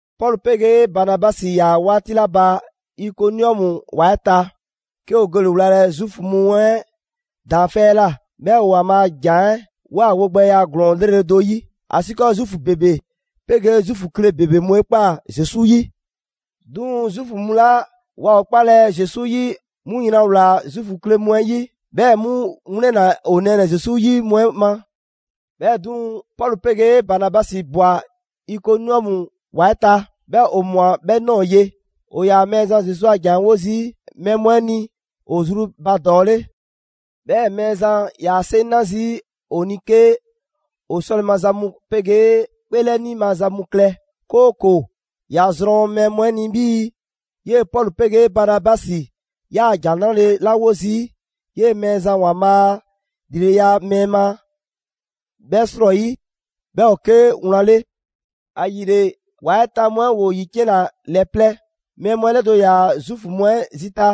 Pɔlu 'pegee Banabasi ‑yaa 'waati 'la ba Ikoniɔmu ‑wa 'ɛ ta, 'ke ‑o gele‑ wlalɛ Zuufu mu 'ɛ daanfɛ' 'ɛ ꞊la. 'Bhɛɛ‑ ‑o ‑Waanbhaa' a ‑jan 'ɛ ꞊woa wogbɛya ‑glɔɔn 'lrele‑ do 'yi, ‑asiikɔɔ Zuufu ‑bebe 'pegee Zuufu kle ‑bebe mu 'e 'kpaa‑ Zesu 'yi. 'Duŋ‑ Zuufu mu 'la waa ‑o 'kpalɛ‑ Zesu 'yi, 'mu yran ꞊wlaa Zuufu kle mu 'ɛ 'yi, 'bhɛɛ‑ 'mu 'wlɛnna‑ 'o nɛɛnɛ‑ Zesu 'yi mu 'ɛ ma. 'Bhɛɛ‑ 'duŋ‑, Pɔlu 'pegee Banabasi ꞊bwa Ikoniɔmu ‑wa 'ɛ ta, 'bhɛɛ‑ ‑o ꞊mwa 'bhɛ ꞊nɔɔ ye. ‑O ‑yaa Mɛɛzan Zesu a ‑jan 'ɛ 'wo zii' mɛɛ mu 'ɛ ni ‑o zru ba ‑dɔɔ 'le. 'Bhɛɛ‑ Mɛɛzan 'yaa‑ 'seŋ 'na zii' ‑o ni 'ke ‑o 'sɔle‑ maza mu 'pegee 'kpeelɛni maza mu klɛ, 'kooko‑ ‑ya zrɔn mɛɛ mu 'ɛ ni 'bhii‑ 'yee‑ Pɔlu 'pegee Banabasi ‑yaa ‑Jan 'Nrale‑ 'la 'wo zii' 'yee‑ Mɛɛzan ‑Waanbhaa' a ‑lileya 'ɛ mɛɛ ma 'bhɛ 'srɔyi, 'bhɛ ‑o 'ke wlan 'le. ‑Ayile, ‑wa 'ɛ ta mu 'ɛ ‑woo ‑yiciɛnna ‑lɛ plɛ: mɛɛ mu 'ɛ 'lɛdo‑ ‑yaa Zuufu mu 'ɛ zita,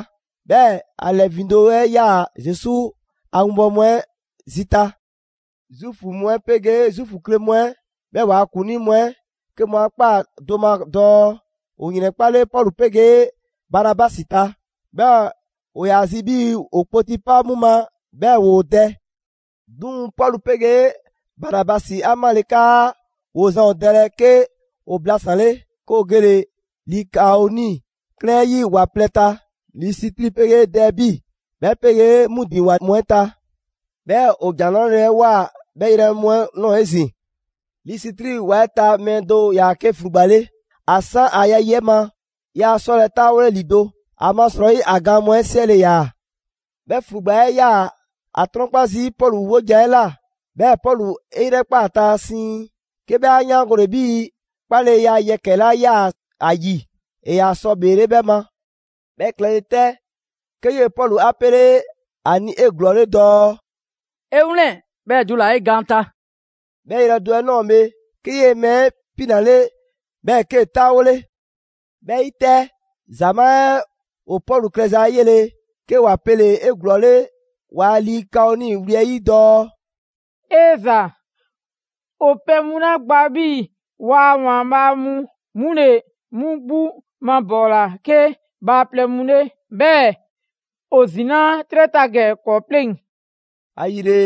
'bhɛɛ‑ ‑a 'lɛ ‑vindo' 'ɛ 'yaa‑ Zesu a 'winbɔwo mu 'ɛ zita. Zuufu mu 'ɛ 'pegee Zuufu kle mu 'ɛ, 'bhɛɛ‑ ‑waa' ‑kuŋlii mu 'ɛ 'ke mu 'a ꞊kpaa do ma dɔɔ ‑o ‑yrɛnkpale Pɔlu 'pegee Banabasi ta. 'Bhɛɛ‑ ‑o ‑yaa zi 'bhii‑ ‑o kpoti 'pa 'mu ma 'bhɛɛ‑ ‑woo dɛ. 'Duŋ‑ Pɔlu 'pegee Banabasi 'a 'male 'kaa ‑woo zan ‑o dɛlɛ, 'ke ‑o blasanle, 'ke ‑o gele‑ Likaoni 'klɛɛn 'ɛ 'yi ‑wa plɛ ta: Lisitri 'pegee Dɛɛbi, 'bhɛ 'pegee 'mu ‑din ‑wa mu 'ɛ ta. 'Bhɛɛ‑ ‑o ‑Jan 'Nrale‑ 'ɛ ꞊woa 'bhɛ yrɛ mu 'ɛ ꞊nɔɔ 'ezin‑. Lisitri ‑wa 'ɛ ta mɛɛ do ‑yaa 'ke ‑flugba 'le. ‑A 'san ‑a ya yi 'ɛ ma yaa 'sɔlɛ‑ 'taawole ‑lido', ‑amasrɔyi ‑a gaan mu 'ɛ 'siɛle‑ ‑yaa. 'Bhɛ ‑flugba 'ɛ 'yaa‑ ‑a 'trɔnkpa zii' Pɔlu 'wojan‑ 'ɛ ꞊la; 'bhɛɛ‑ Pɔlu 'e 'yrɛkpaa‑ ‑a ta siiŋ, 'ke 'bhɛ 'a 'yaangole 'bhii‑ 'kpaleya yɛkɛ‑ 'la 'yaa‑ ‑a ‑yi ‑e ‑yaa sɔ ‑bheele' 'bhɛ ma. 'Bhɛ klɛle 'tɛ, 'ke 'yee‑ Pɔlu 'a 'pele 'a ni 'eglɔɔle dɔɔ: «'E 'wlɛn‑, 'bhɛɛ‑ dula‑ 'e gaan ta!» 'Bhɛ yrɛ do 'ɛ ꞊nɔɔ bhe, 'ke 'yee‑ mɛɛ 'ɛ 'pinale, 'bhɛɛ‑ 'kee‑ 'taawole. 'Bhɛ 'yi 'tɛ, ‑zamaa' 'ɛ ‑o Pɔlu klɛza 'ɛ 'yele‑, 'ke ‑wa pele‑ 'eglɔɔle ‑waa' Likaoni wli 'ɛ 'yi dɔɔ: «'E ‑za! 'O pɛ mu 'la gba 'bhii‑ 'waa‑ ‑waanbhaa' mu 'mu ‑le 'mu 'gbu mabɔɔla 'ke bhaaplɛŋ mu 'le, 'bhɛɛ‑ ‑o ‑zinaa' 'trɛ ta ‑gɛ ‑kɔɔ' 'pleŋ!» ‑Ayile,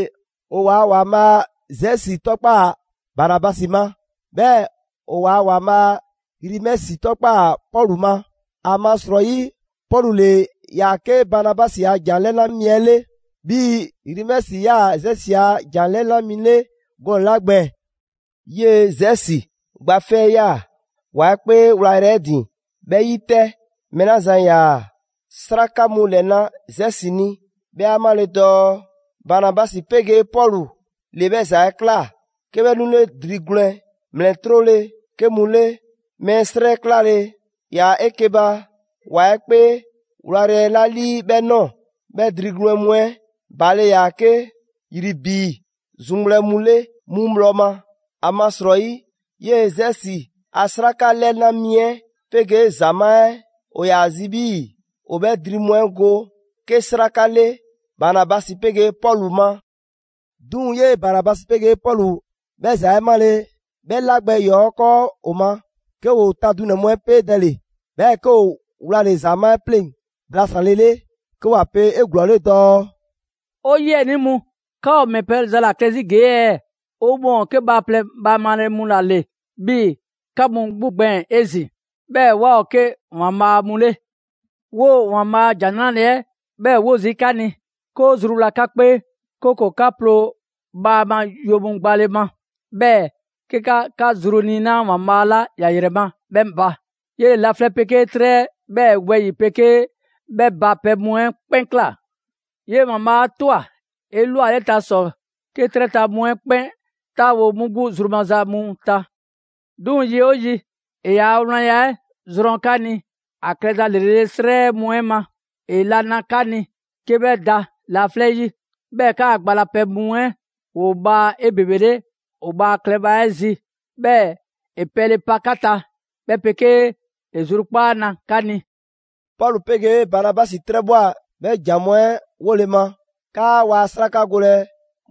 ‑o ‑waa' ‑waanbhaa' Zesi 'tɔkpaa‑ Banabasi ma, 'bhɛɛ‑ ‑o ‑waa' ‑waanbhaa' Rimɛsi 'tɔkpaa‑ Pɔlu ma; ‑amasrɔyi Pɔlu ‑le ‑yaa 'ke Banabasi a ‑jan 'lɛna mi 'ɛ 'le, 'bhii‑ Rimɛsi ‑yaa Zesi a jan 'lɛna mi 'le gɔnɛ‑ 'la gbɛɛn‑. 'Yee‑ Zesi gba 'fɛ 'yaa‑ ‑wa 'ɛ 'kpee 'wlayrɛ‑ 'ɛ ‑din. 'Bhɛ 'yi 'tɛ, mɛɛ 'la zan ‑yaa 'sraka mu ‑lɛna' Zesi ni, 'bhɛ 'a 'male‑ dɔɔ Banabasi 'pegee Pɔlu ‑le 'bhɛ ‑za 'ɛ ꞊kla, 'ke 'bhɛ 'nule dri gwlɛn ‑mlɛ 'trole‑ 'ke mu 'le mɛɛ 'srɛ 'ɛ 'klale‑ ‑yaa 'eke‑ ba ‑wa 'ɛ 'kpee 'wlayrɛ‑ 'la 'lii 'bhɛ ꞊nɔɔ. 'Bhɛ dri gwlɛn mu 'ɛ baale ‑yaa 'ke ‑yribi zuŋgbhlɛ mu 'le 'mu bhlɔ ma. ‑Amasrɔyi 'yee‑ Zesi a 'sraka 'lɛna mi 'ɛ 'pegee ‑zamaa' 'ɛ ‑o ‑yaa zi 'bhii‑ ‑o 'bhɛ dri mu 'ɛ go 'ke 'sraka 'le Banabasi 'pegee Pɔlu ma. 'Duŋ‑ 'yee‑ Banabasi 'pegee Pɔlu 'bhɛ ‑za 'ɛ 'male, 'bhɛ 'la gbɛ ‑yɔɔ 'ɛ 'kɔɔ ‑o ma, 'ke ‑woo ta dunɛ‑ mu 'ɛ 'peedɛle, 'bhɛɛ‑ 'ke ‑o wlale‑ ‑zamaa' 'ɛ 'pleŋ blasanlele, 'ke ‑wa pe 'eglɔɔle dɔɔ: «'O 'yiɛnii mu, 'ka ‑o ‑mɛ pɛ za ‑la klɛ 'zi ‑gee' ɛɛ? 'O mɔɔ ‑o 'ke bhaaplɛŋ bhaamale mu ‑la ‑le 'bhii‑ 'ka mu 'gbu gbɛɛn‑ 'ezin‑, 'bhɛɛ‑ 'waa ‑o 'ke ‑waanbhaa' mu 'le. 'Woo‑ ‑Waanbhaa' a ‑Jan 'Nrale‑ 'ɛ 'bhɛɛ‑ 'wo zii' 'ka ni, 'ke 'o zruwla 'ka 'kpee, 'kooko 'ka 'ploo‑ bhaama yo mu gbale ma; 'bhɛɛ‑ 'ke 'ka 'ka zru 'niinaa ‑Waanbhaa' 'la ‑ya ‑yrɛ ma 'bhɛ ba. 'Yele‑ laflɛ' 'pegee 'trɛ 'bhɛɛ‑ wɛyi‑ 'pegee 'bhɛ ba pɛ mu 'ɛ 'kpɛn ꞊kla. 'Yee‑ ‑Waanbhaa' 'a ꞊twa 'elwaleta ‑sɔ 'ke 'trɛ ta mu 'ɛ 'kpɛn 'taawo‑ 'mu 'gbu zru maza mu ta. 'Duŋ‑ yi 'oo yi, ‑e ‑yaa' wlanya 'ɛ zrɔn 'ka ni ‑a klɛza ‑lrele' 'srɛ mu 'ɛ ma: ‑e la na 'ka ni 'ke 'bhɛ da laflɛ' 'yi, 'bhɛɛ‑ 'kaa‑ gba la pɛ mu 'ɛ ‑woo bhaa 'ebebele ‑o bhaa klɛ bhla 'ɛ zi, 'bhɛɛ‑ ‑e pɛle pa 'ka ta, 'bhɛ 'pegee ‑e zrukpaa' na 'ka ni.» Pɔlu 'pegee Banabasi 'trɛbhwa꞊ 'bhɛ ‑jan mu 'ɛ 'wole‑ ma 'kaa waa 'sraka golɛ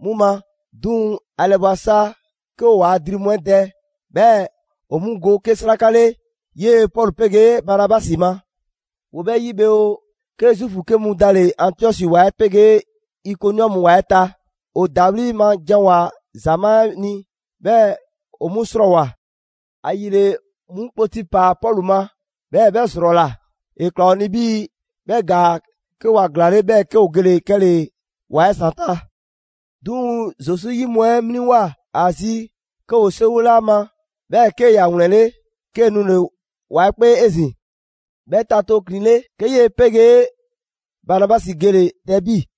'mu ma; 'duŋ‑, ‑a ‑lɛbwa sa 'ke ‑o waa dri mu 'ɛ dɛ, 'bhɛɛ‑ ‑o 'mu go 'ke 'sraka 'le 'yee‑ Pɔlu 'pegee Banabasi ma. ‑Woo 'bhɛ 'yi bhe oo, 'ke Zuufu 'ke mu dale‑ Antiɔsi ‑wa 'ɛ 'pegee Ikoniɔmu ‑wa 'ɛ ta. ‑O ‑dawli' ma janwoa‑ ‑zamaa' 'ɛ ni, 'bhɛɛ‑ ‑o 'mu 'srɔɔwoa‑. ‑Ayile 'mu kpoti ‑paa Pɔlu ma, 'bhɛɛ‑ 'bhɛ ‑zrɔla. ‑E ꞊kla ‑o ni 'bhii‑ 'bhɛ ‑gaa 'ke ‑wa ‑glaanle', 'bhɛɛ‑ 'ke ‑o gele‑ 'kɛle‑ ‑wa 'ɛ ‑zanta'. 'Duŋ‑ Zesu 'yi mu 'ɛ 'mliŋwoa‑ ‑a zi, 'ke ‑woo 'seriwole ‑a ma, 'bhɛɛ‑ 'ke ‑ya ‑wlɛnle', 'kee‑ nule‑ ‑wa 'ɛ 'kpee 'ezin‑. 'Bhɛ ta tooklinle, 'ke 'yee‑ 'pegee Banabasi gele‑ Dɛɛbi.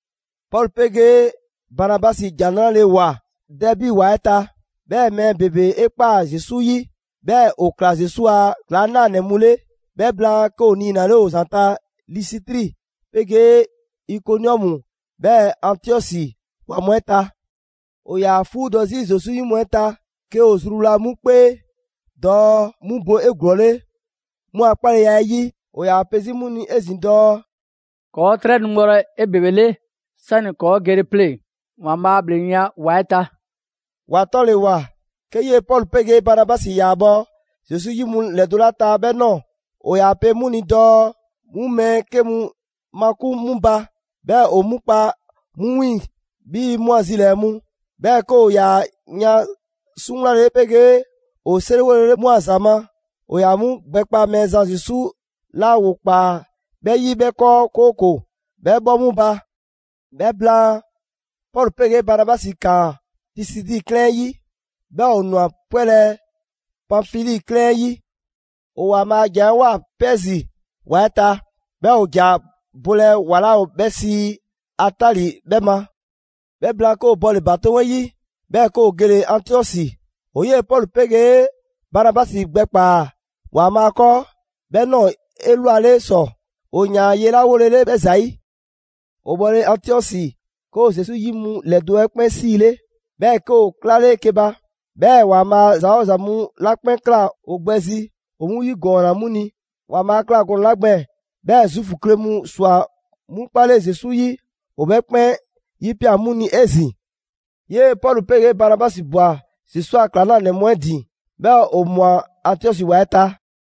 Pɔlu 'pegee Banabasi ‑Jan 'Nrale‑ 'e ꞊woa Dɛɛbi ‑wa 'ɛ ta, 'bhɛɛ‑ mɛɛ ‑bebe 'e ꞊kpaa Zesu 'yi, 'bhɛɛ‑ ‑o ꞊kla Zesu a ‑klaŋlanɛ mu 'le. 'Bhɛ blaan, 'ke ‑o niinale ‑o ‑zanta' Lisitri 'pegee Ikoniɔmu 'bhɛɛ‑ Antiɔsi ‑wa mu 'ɛ ta. ‑O ‑yaa 'fuudɔ 'zi Zesu 'yi mu 'ɛ ta, 'ke ‑o zruwla 'mu 'kpee dɔɔ 'mu bo 'eglɔɔle 'mu a 'kpaleya 'ɛ 'yi. ‑O ‑yaa pe 'zi 'mu ni 'ezin‑ dɔɔ: «‑Kɔɔ' 'trɛ nu bhɔlɛ‑ 'ebebele 'sani‑ ‑kɔɔ' gele pleŋ‑ ‑Waanbhaa' a ‑bhleŋgbeya ‑wa 'ɛ ta.» ‑Wa 'tɔle‑ ‑wa, 'ke 'yee‑ Pɔlu 'pegee Banabasi ‑yaa bhɔ Zesu 'yi mu ‑lɛdo' 'la ta 'bhɛ ꞊nɔɔ, ‑o ‑yaa pe 'mu ni dɔɔ 'mu mɛɛ 'ke mu makun 'mu ba, 'bhɛɛ‑ ‑o 'mu kpa 'mu 'wiiŋ‑ 'bhii‑ 'mu a zilɛɛ‑ mu. 'Bhɛɛ‑ 'ke ‑o ‑yaa yan 'suŋwlale 'pegee ‑o 'seriwolele 'mu a ‑za ma; ‑o ‑yaa 'mu gbɛkpa Mɛɛzan Zesu 'la ‑woo ꞊kpaa 'bhɛ 'yi, 'bhɛ 'kɔɔ 'kooko‑ 'bhɛ 'bhɔ 'mu ba. 'Bhɛ blaan, Pɔlu 'pegee Banabasi ꞊kaan Pisidi 'klɛɛn 'ɛ 'yi 'bhɛɛ‑ ‑o ꞊nwa 'pwɛlɛ‑ Panfili 'klɛɛn 'ɛ 'yi. ‑O ‑Waanbhaa' a ‑jan 'ɛ ꞊woa Pɛɛzi ‑wa 'ɛ ta, 'bhɛɛ‑ ‑o ‑ja bhɔlɛ ‑wa 'la ‑o 'bhɛ sii Atali 'bhɛ ma. 'Bhɛ blaan, 'ke ‑o bɔle‑ ‑batoŋ' 'yi, 'bhɛɛ‑ 'ke ‑o gele‑ Antiɔsi. ‑O 'yee‑ Pɔlu 'pegee Banabasi gbɛkpaa‑ ‑Waanbhaa' 'kɔɔ 'bhɛɛ‑ ꞊nɔɔ 'elwale ‑sɔ, ‑o ‑yaan ye 'la wolele 'bhɛɛ‑ ‑zayi'. ‑O bhɔle‑ Antiɔsi, 'ke ‑o Zesu 'yi mu ‑lɛdo' 'ɛ 'kpɛn 'siile, 'bhɛɛ‑ 'ke ‑o 'klale 'eke‑ ba. 'Bhɛɛ‑ ‑Waanbhaa' ‑za 'oo ‑za mu 'la 'kpɛn ꞊kla ‑o gbɛ zi ‑o 'mu ‑yigɔɔnna 'mu ni. ‑Waanbhaa' 'a ꞊kla gɔnɛ‑ 'la gbɛɛn‑ 'bhɛɛ‑ Zuufu kle mu꞊swa 'mu 'kpale Zesu 'yi, ‑o 'bhɛ 'kpɛn 'yipia꞊ 'mu ni 'ezin‑. 'Yee‑ Pɔlu 'pegee Banabasi ꞊bwa Zesu a ‑klaŋlanɛ mu 'ɛ ‑din, 'bhɛɛ‑ ‑o ꞊mwa Antiɔsi ‑wa 'ɛ ta.